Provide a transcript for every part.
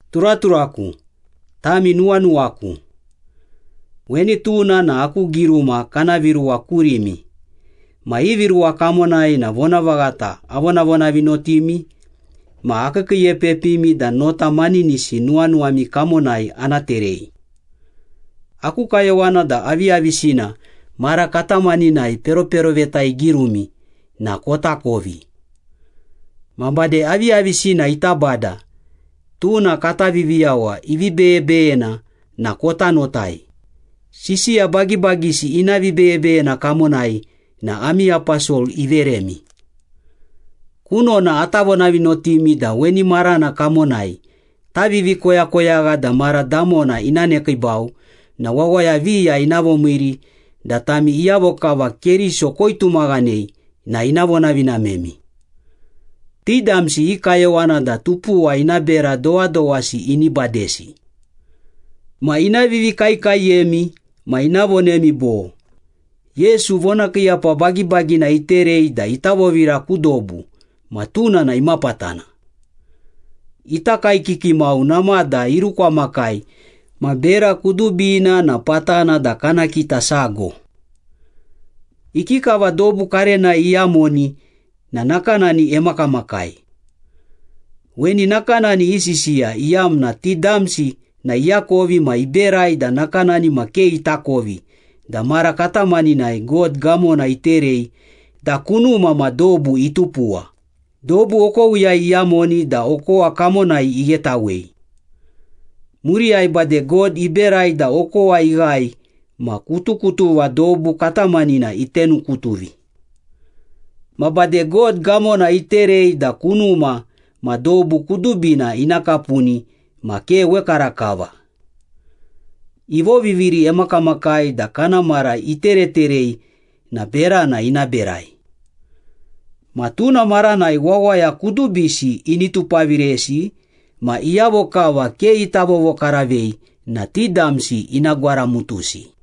Turaturaku, tami nuwanuwaku. Weni tuna na aku giruma kana viruwa kurimi ma ivi ruwa kamonai na vonavaghata avonavonavinotimi ma akiikiiepepimi da nota maninisi nuwanuwami kamonai ana terei. Aku kayowana da aviyavisina mara katamaninai peroperoveta igirumi na kotakovi. Ma bade aviyavisina ita Bada, tuna kata Viviyawa ivi beyebeyena na kota notai, sisiya bagibagisi ina vibeyebeyena kamonai na ami aposol iveremi. Kunona ata vonavinotimi da weni marana kamonai tavivi koyakoyagha da mara damona ina nekiibau na wawaya viya ina vomiiri da tami iyavo kava Keriso koitumaghanei na ina vonavinamemi. Ti damsi i kayowana da tupuwa ina bera dowadowasi ini badesi. Ma ina vivikaekaeyemi ma ina vonemi bo, “Yesu vonakiiyapa bagibagina iterei da ita vovira ku dobu ma tuna na imapatana? Ita kaekiki mau namada irukwamakai ma bera kudubina na patana da kana kita sago. Ikikava dobu karenai iyamoni na nakanani emakamakai.” Weni nakanani isisiya iyamna ti damsi na iakovi ma iberai da nakanani ma ke itakovi da mara katamaninai God gamona iterei da kunuma ma dobu itupuwa, dobu okowiyai iyamoni da okowa kamonai ighetawei. Muriyai bade God iberai da okowa ighae ma kutukutuva dobu katamanina itenukutuvi. Ma bade God gamona iterei da kunuma ma dobu kudubina ina kapuni ma ke wekarakava. Ivoviviri emakamakai da kana mara itereterei na berana ina berai. Ma tuna maranai wawaya kudubisi ini tupaviresi ma iyavo kava ke ita vovokaravei na ti damsi ina gwaramutusi.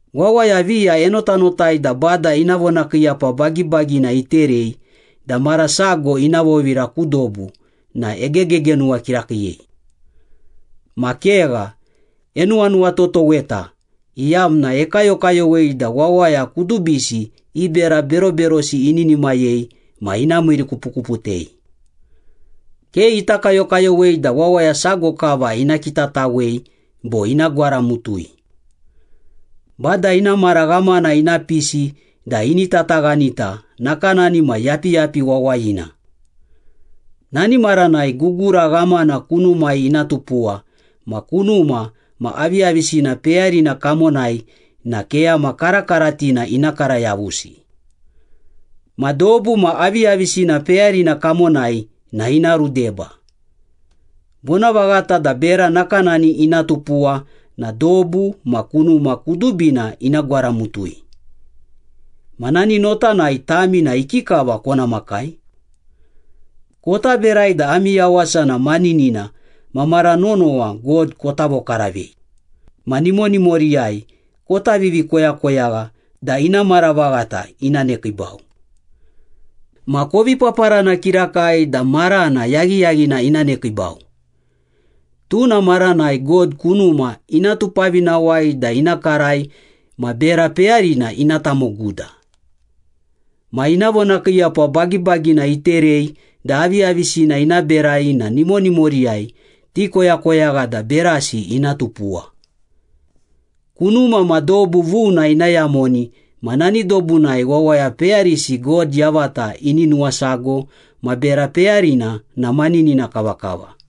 Wawaya viya enotanotai da Bada ina vonakiiyapa bagibagina iterei da mara sago ina vovira ku dobu na egegegenuwa kirakiiyei. Ma kegha, enuwanuwatotoweta iyamna ekayokayowei da wawaya kudubisi i bera beroberosi ininimayei ma ina miirikupukuputei. Ke ita kayokayowei da wawaya sago kava ina kitatawei bo ina gwaramutui. Bada ina mara ghamana ina pisi da ini tataghanita nakanani ma yapiyapi wawayina. Nani maranai gugura ghamana kunumai ina tupuwa ma kunuma ma aviyavisina peyarina kamonai na keyama karakaratina ina kara yavusi. Ma dobu ma aviyavisina peyarina kamonai na ina rudeba. Vonavaghata da bera nakanani ina tupuwa na dobu ma kunuma kudubina ina gwaramutui. Ma nani notanai tami na ikikava kona makai? Kota berai da ami yawasa na maninina ma mara nonowa God kota vokaravei, ma nimonimoriyai kota vivikoyakoyagha da ina mara vaghata ina nekiibau. Ma kovi paparana kirakai da marana yaghiyaghina ina nekiibau. Tuna maranai God kunuma ina tupavinawai da ina karai ma bera peyarina ina tamoguda. Ma ina vonakiiyapa bagibagina iterei da aviyavisina ina berai na nimonimoriyai tikoyakoyagha da berasi ina tupuwa. Kunuma ma dobu vuna ina yamoni ma nani dobunai wawaya peyarisi God yavata ini nuwasago ma bera peyarina na maninina kavakava.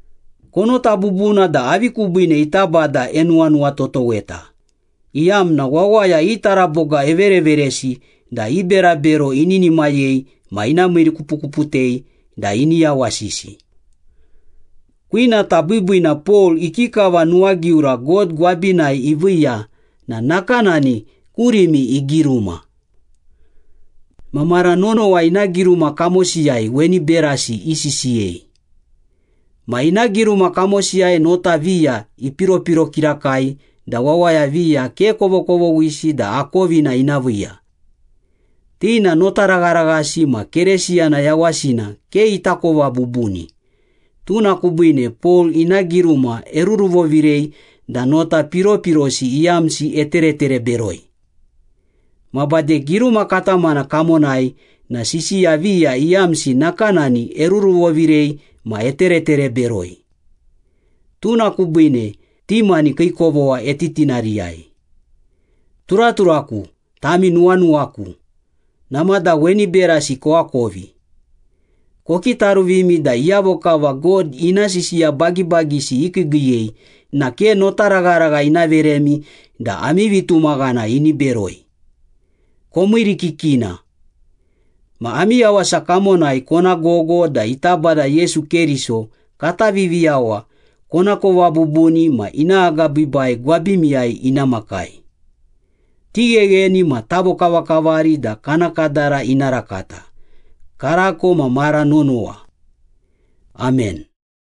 Konota bubuna da avi kubiine ita Bada enuwanuwatotoweta, iyamna wawaya i taraboga evereveresi da i berabero ininimayei ma ina miirikupukuputei da ini yawasisi. Kwinata biibiina Pol ikikava nuwagiura God gwabinai iviiya na nakanani kurimi igiruma. Ma mara nonowa ina giruma kamosiyai weni berasi isisiyei. Ma ina giruma kamosiyai nota viya ipiropiro kirakai da wawaya viya ke kovokovoghisi da akovina ina viiya. Ti na notaragharaghasi ma Keresiyana yawasina ke itakova bubuni, tuna kubiine Pol ina giruma eruruvovirei da nota piropirosi iyamsi eteretere beroi. Ma bade giruma katamana kamonai na sisiya viya iyamsi nakanani eruruvovirei ma eteretere beroi. Tuna kubiine ti mani kii kovogha etitinariyai. Turaturaku, tami nuwanuwaku, namada weni berasi koakovi. Kokitaruvimi da iyavo kava God ina sisiya bagibagisi ikiigiiyei na ke notaragharagha ina veremi da ami vitumaghana ini beroi. Komiirikikina. Ma ami yawasa kamonai kona gogo da ita Bada Yesu Keriso kata Viviyawa konakova bubuni ma ina agabiibai gwabimiyai ina makai. Tighegheni ma tavokavakavari da kana kadara ina rakata, karako ma mara nonowa. Amen.